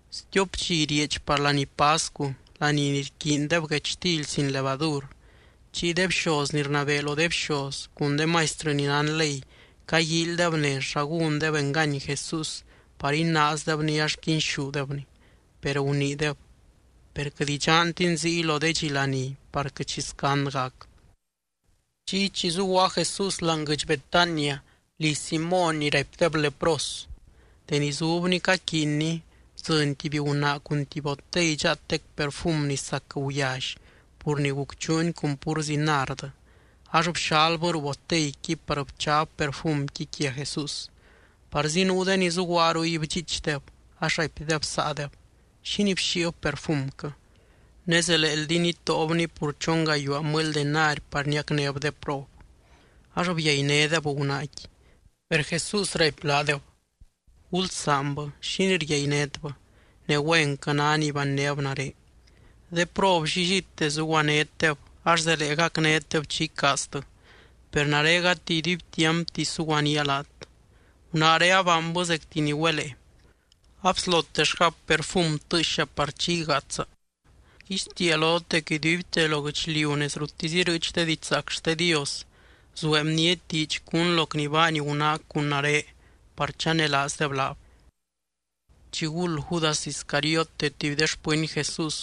Stiop dxi rieedx par laní pascu, laní ni rquiindeb guechtily sin levadur, chiy de bxoz ni rnabee lo de bxoz cun de maistrɨ ni nán ley caguíilydeb nez xa gúndeb engany Jesús par inaazdebny ax quinxúdebny. Per guniideb: —Per quɨt idxantin ziy lo de dxi laní par quɨt xi scand gac. Chiy chi zuguaa Jesús láani guɨdx Betania liz Simóny ni raipdeb lepros, deni zubny caquiinny, bdzɨny tuby gunaa cun tuby botey dxaatec perfum ni sac guyally pur ni gucchuuni cun púrzi nard. Ax bxalbɨ ruu boteyqui par bchab perfumqui quia Jesús. Parzi nuu de ni zuguaa ruy bdxiichdeb, ax raipdeb saadeb: —¿Xínii bxíib perfumquɨ? Ne zeleeldi nitóobni pur chon gayuaa mɨly denari par niacnéb de prob. Ax byainédeb gunaaqui. Per Jesús raipy laadeb: —Gulsaanbɨ. ¿Xínii ryainétbɨ? Ne güenquɨ ná ni bannéb nare. De prob llillite zuguanétdeb ax zelee gacnétdeb chi icaaztɨ, per nare gati iduibtiampti suguanía laat. Gunaaré abaanbɨ zecti ni güelee. Abslotellgab perfum tɨɨxa par chi igaatsa. Rguixtiia lot dec iduibte lo guɨchliu nez ruttisy irɨɨch de didxzaac xte Dios, zuee bniety diidx cún loc ni baany gunaac cun nare par chanelaazdeb laab. Chiguld Judas Iscariote, tuby de xpɨny Jesús,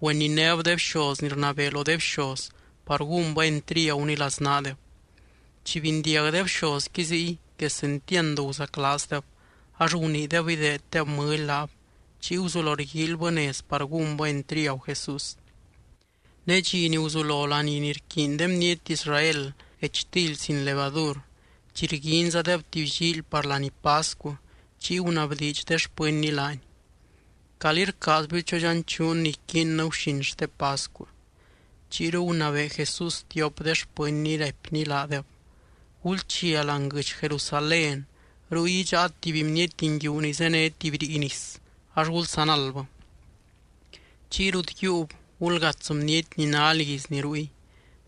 güeninéb de bxoz ni rnabee lo de bxoz par gúnbɨ entriaguny laznaadeb. Chi bindiag de bxozqui ziy, quesentiand guzaclaazdeb. Ax guniideb ideeddeb mɨly laab. Chiy guzulo rguíilybɨ nez par gúnbɨ entriagu Jesús. Ne dxi ni guzulo laní ni rquiiny de bniety Israel guechtily sin levadur, chi rguinzadeb tuby llíily par laní pascu, chiy gunabdiidx de xpɨnny laany: —¿Calí rcaazbiu chodxanchuun ni iquiinnɨ guxin xte pascu? Chiyru gunabee Jesús tiop de xpɨnny, raipny laadeb: —Gulchia láani guɨdx Jerusalén. Ruy idxáat tuby bniety nguiu ni zéne tuby rii nis ax gulsanaldbɨ. Chiy rut yiiub, gulgats bniety ni ná lizni ruy: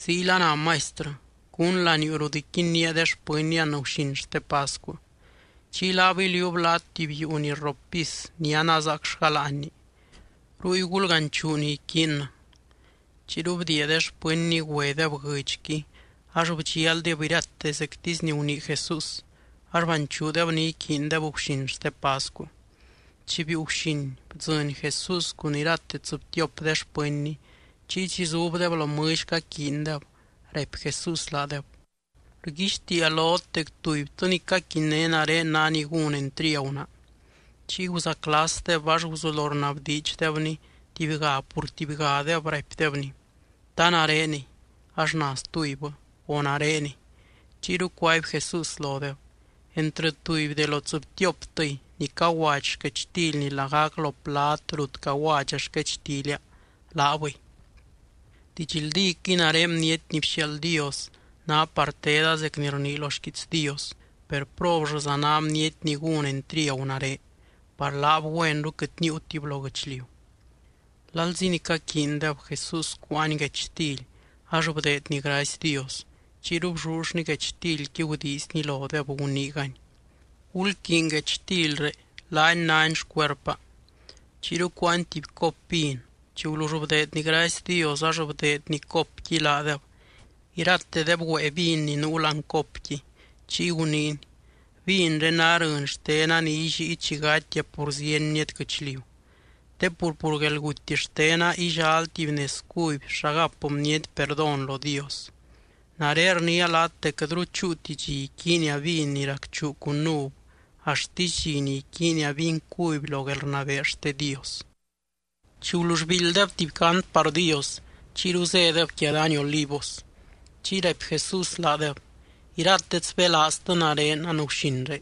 “Ziyla ná Maistrɨ: ¿Cún laniuu rut iquinnía de xpɨnnia anguxin xte pascu?” Chiy laab iliuub laat tuby yuu ni rrop pis ni anazaacllga láanni. Ruy gulganchuu ni iquiinnɨ. Chiyru bdiia de xpɨnny güedeb guɨdxqui. Ax bdxialdeb irate zectisy ni gunii Jesús. Ax banchuudeb ni iquiindeb guxin xte pascu. Chi biiu guxin, bdzɨny Jesús cun irate tsɨbtiop de xpɨnny. Chiy chi zubdeb lo mɨlly caquiindeb, raipy Jesús laadeb: —Rguixtiia lot dec tubytɨ ni caquinné nare ná ni gún entriagu naa. Chiy guzaclasdeb, ax guzulo rnabdiidxdebny tubyga pur tubygadeb, raipdebny: —¿Ta nareniy? Ax na stubybɨ: —O, ¿nareniy? Chiyru cuaby Jesús lodeb: —Entrɨ tuby de lo tsɨbtioptɨy, ni caguadxy xquechtilni lagac lo plad rut caguadxa xquechtilia, laabɨy. Didxldíquɨy nare Bniety ni bxiaald Dios ná par teda zec ni rnii lo xquiits Dios. Per, ¡probllɨza ná bniety ni gún entriagu nare! Par laab güenru quɨt níiutib lo guɨchliu. Lalzi ni caquiindeb, Jesús cuáany guechtily ax bdeedny gracy Dios. Chiyru bllullny guechtilqui gudiizny lodeb, guniigany: —Gulquiiny guechtilré, laani náni xcuerpa. Chiyru cuáany tuby cop vin. Chi gulull bdeedny gracy Dios, ax bdeedny copqui laadeb. Iratedeb güée vin ni nuu láani copqui. Chiy guniiny: —Vinré ná rɨny xtena ni illíi chi gatia pur zieny bniety guɨchliu. Te pur, pur guelguty xtena illal tuby nez cuby xa gap bniety perdón lo Dios. Nare rniia laat dec quɨtru chúuti dxi iquiinia vin ni racchuu cun uv, axtisy dxi ni iquiinia vin cuby lo guelrnabee xte Dios. Chi gulull biildydeb tuby cant par Dios, chiyru zédeb quia dany Olivos. Chiy raipy Jesús laadeb: —Iratet sbélaaztɨ nare anguxinré,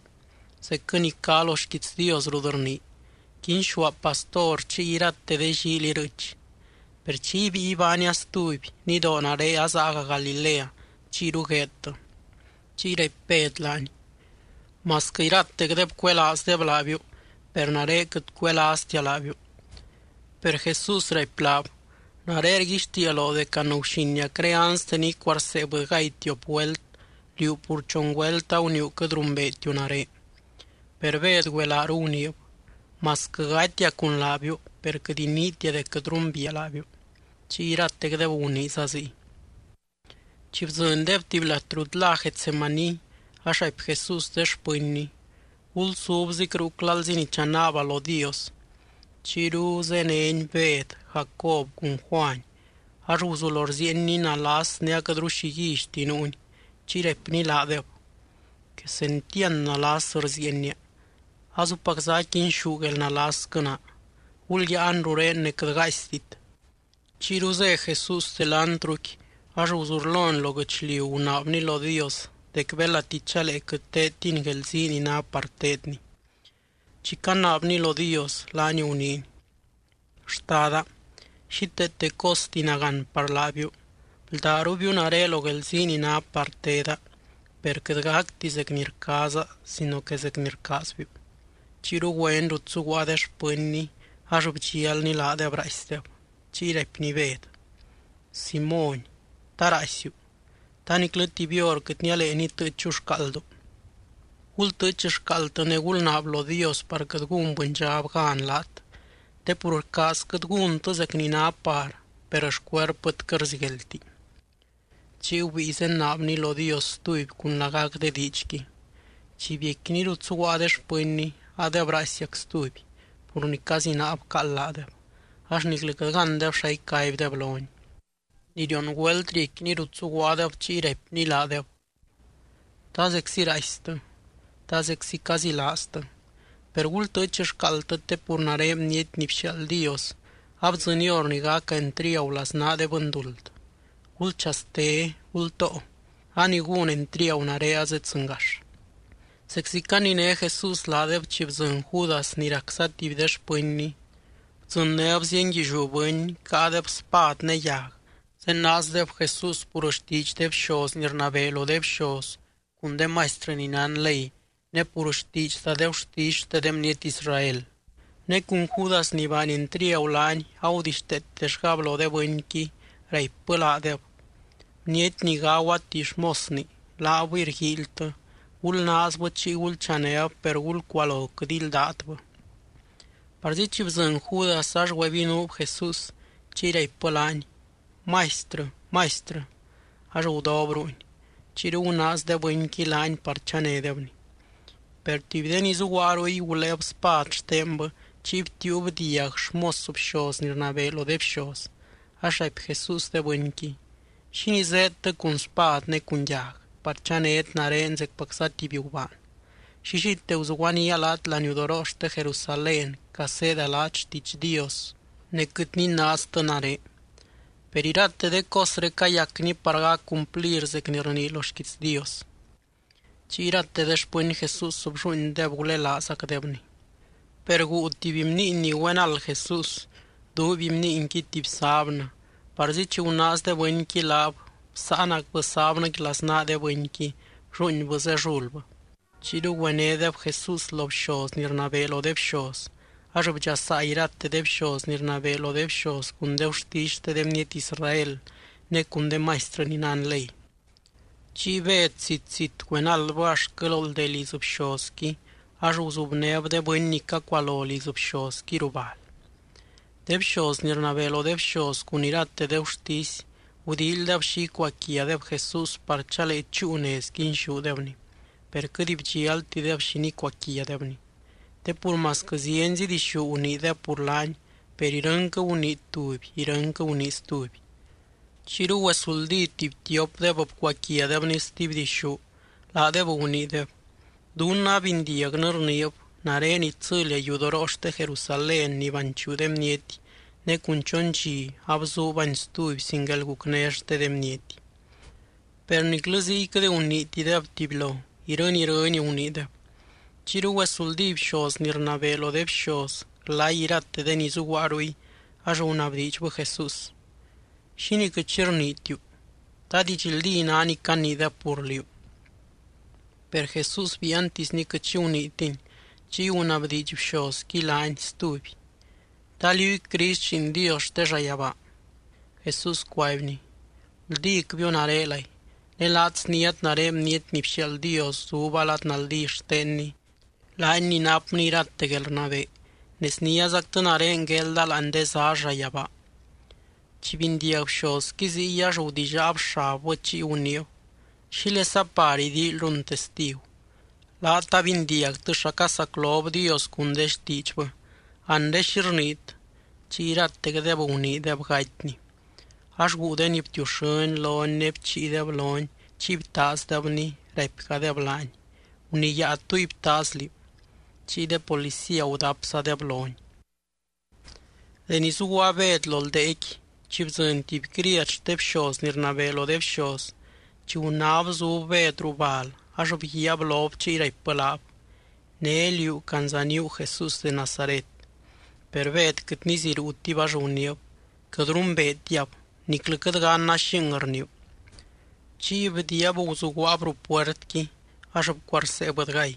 zecquɨ ni cá lo xquiits Dios rut rnii: “Quinxúa pastor, chiy irate de llíily irɨɨch.” Per chi ibíi ibánia stuby, nidoo nare azaaga Galilea chiyru gueedtɨ. Chiy raipy Bed laany: —Masquɨ iratecdeb cuelaazdeb laabiu, per nare quɨt cuelaaztia laabiu. Per Jesús raipy laab: —Nare rguixtiia loo dec anguxiniacré anste ni icuarsee bɨdygay tiop güelt, liú pur chon güelt aguniiu quɨt rumbeetiu nare. Per Bed güelaaru guniib: —Masquɨ gatia cun laabiu, per quɨt iniitia dec quɨt rumbiia laabiu. Chiy iratecdeb guniiza ziy. Chi bdzɨndeb tuby lat rut lá Getsemaní ax raipy Jesús de xpɨnny: —Gulsubzic ruc lalzi ni chanaaba lo Dios. Chiyru zéneny Bed, Jacob cun Juany. Ax guzulo rziienny nalas ne aquɨtru xi guíllyti nuuny. Chiy raipny laadeb: —Quesentiand nalas rziienia. Azupacza aquinxú guelnalasquɨ naa. Gulyáan rurén ne quɨt gaaistit. Chiyru zé Jesús delantruqui, ax guzurlony lo guɨchliu gunaabny lo Dios dec belati chalee quɨt teedtiny guelzii ni ná par teedny. Chi canaabny lo Dios, laany guniiny: —Xtada, xíteete costi nagán par laabiu. Bldárubiu nare lo guelzii ni ná par teda, per quɨt gacti zec ni rcaaza sino que zec ni rcaazbiu. Chiyru güeny rut zuguaa de xpɨnny, ax bdxialny laadeb raaisdeb. Chiy raipny Bed: —Simóny, ¿ta raaisiu? ¿Ta niclɨ tuby hor quɨt nialee nitɨɨchu xcaaldu? Gultɨɨch xcaaldtɨ ne gulnaab lo Dios par quɨt gún bɨndxab gan laat. Te pur rcaazquɨt gúntɨ zec ni ná par, per xcuerpɨt quɨt rzigueldti. Chiy gubíi zenaabny lo Dios stuby cun lagac de diidxqui. Chi biecquiny rut zuguaa de xpɨnny, adeb raaisiac stuby, pur ni cazinaa bcaald laadeb. Ax niclɨ quɨt gándeb xa icaibdeb lony. Ni rion güelt riecquiny rut zuguaadeb chiy raipny laadeb: —¿Ta zeczi raaistɨ? ¿Ta zeczi cazilaaztɨ? Per gultɨɨch xcaaldtɨ te pur nare Bniety ni bxiaald Dios, abdzɨny hor ni gaca entriagu laznaa de bɨnduld. Gulchaste. Gultoo. A ni gún entriagu nare azeddzɨngax. Zeczi caniné Jesús laadeb chi bdzɨny Judas ni racza tuby de xpɨnny. Bdzɨnnéb zienguilliú bɨny, caadeb spad ne yag. Zenaazdeb Jesús pur xtiidx de bxoz ni rnabee lo de bxoz cun de maistrɨ ni nán ley, ne pur xtiidxza de gurtisy xte de bniety Israel. Ne cun Judas ni baany entriagu laany agudixteetellgab lo de bɨnqui, raipbɨ laadeb: —Bniety ni gagua tuby xmosni, laabɨy rguíilytɨ, gulnaazbɨ chiy gulchanéb per gulcualo quɨt ildátbɨ. Parzi chi bdzɨny Judas, ax güebinuub Jesús chiy raipbɨ laany: —Maistrɨ, Maistrɨ. Ax gudob ruuny. Chiyru gunaaz de bɨnqui laany par chanédebny. Per tuby de ni zuguaa ruy guléeb spad xtenbɨ chiy btiiub tuby diag xmos bxoz ni rnabee lo de bxoz. Ax raipy Jesús de bɨnqui: —¿Xínii zéedtɨ cun spad ne cun yag par chanét nare zecpacza tuby gubaan? Llillite guzuguanía laat laniudoroo xte Jerusalén caseeda laat xtiidx Dios, ne quɨt ninaaztɨ nare. Per irate de cosré cayacni par gac cumplir zec ni rnii lo xquiits Dios. Chiy irate de xpɨny Jesús, blluuindeb, gulelaazgacdebny. Per guu tuby bniiny ni güenald Jesús, duuiby bniinqui tuby sábnɨ. Parzi chi gunaaz de bɨnqui laab, bsáanacbɨ sábnɨqui laznaa de bɨnqui, blluuinbɨ zellulbɨ. Chiyru güenédeb Jesús lo bxoz ni rnabee lo de bxoz. Ax bdxasaa irate de bxoz ni rnabee lo de bxoz cun de gurtisy xte de bniety Israel ne cun de maistrɨ ni nán ley. Chiy Bed zit, zit güenaldbɨ axtquɨ lo ldee liz bxozqui ax guzubnéb de bɨny ni cacualo liz bxozqui ruu bal. De bxoz ni rnabee lo de bxoz cun irate de gurtisy gudíilydeb xi icuaquiadeb Jesús par chalee chúu nez quinxúdebny, per quɨt bdxialtideb xi nicuaquiadebny. Te pur masquɨ zienzi dixú guniideb pur laany, per irɨnquɨ gunii tuby irɨnquɨ gunii stuby. Chiyru güesuldí tuby tiopdeb bcuaquiadebny stuby dixú, laadeb guniideb: —Dunnɨ abindiagnɨ rniib: “Nare itsɨlia yudoroo xte Jerusalén ni banchuu de bniety, ne cun chon dxi abzuubani stuby, sin guelgucné xte de bniety.” Per niclɨ ziy quɨt guniitideb tubylo, irɨny, irɨny guniideb. Chiyru güesuldí bxoz ni rnabee lo de bxoz glay irate de ni zuguaa ruy ax gunabdiidxbɨ Jesús: —¿Xínii quɨt xi rniitiu? ¿Ta didxldí ná ni caniideb pur liú? Per Jesús biiantisny quɨt xi guniitiny. Chiy gunabdiidx bxozqui laany stuby: —¿Ta liúy Crist Lliin Dios xte llayabaa? Jesús cuaibny: —Guldícbiu, narelay. Ne laat sniát nare Bniety ni bxiaald Dios zuba lad naldí xtenny, laany ni napny irate guelrnabee ne sniázactɨ nare guelda láani de zá llayabaa. Chi bindiag bxozqui ziy ax gudillaab xabbɨ chiy guniib: —¿Xílesa par idíilyrun testigu? Laat abindiagtɨ xa casaclob Dios cun de xtiidxbɨ. Anre, ¿xi rniit? Chiy iratecdeb guniideb gatyny. Ax guu de ni btiuxɨ́ny lony ne bchiideb lony chiy btaazdebny, raipgadeb laany: —¡Guniyáa túy btaaz liú! Chiy de policía gudapzadeb lony. Deni zuguaa Bed lo ldeequi, chi bdzɨny tuby criad xte bxoz ni rnabee lo de bxoz. Chi gunáb zub Bed ruu bal, ax bguiaab lob chiy raipbɨ laab: —Né liú candzaníu Jesús de Nazaret. Per Bed quɨt niziruutib ax guniib: —Quɨt rumbeetiab. Niclɨ quɨt ganna xing rniiu. Chiy bdiiab guzuguaab ruu puertqui ax bcuarsee bɨdygay.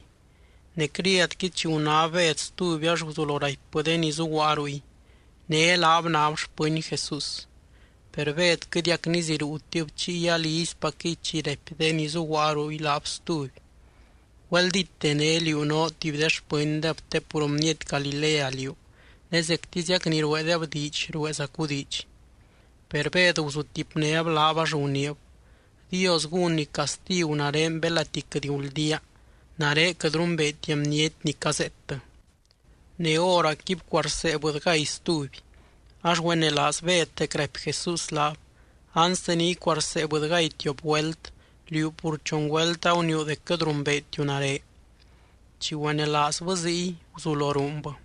Ne criadqui chi gunáb Bed stuby ax guzulo raipbɨ de ni zuguaa ruy: —Né laab náb xpɨny Jesús. Per Bed quɨtiac niziruutib. Chiy alizypacquɨy chi raipy de ni zuguaa ruy laab stuby: —Güeldíte né liú noo tuby de xpɨndeb te pur bniety Galilea liú, ne zectiziac ni rueedeb diidx rueezacu diidx. Per Bed guzutipnéb laab ax guniib: —Dios gúnny castigu nare belati quɨt guldía, nare quɨt rumbeetia bniety ni cazeettɨ. Ne hóracqui bcuarsee bɨdygay stuby. Ax güenelaaz Bed dec raipy Jesús laab: “Anste ni icuarsee bɨdygay tiop güelt, liú pur chon güelt aguniiu dec quɨt rumbeetiu nare.” Chi güenelaazbɨ ziy, guzulo ruunbɨ.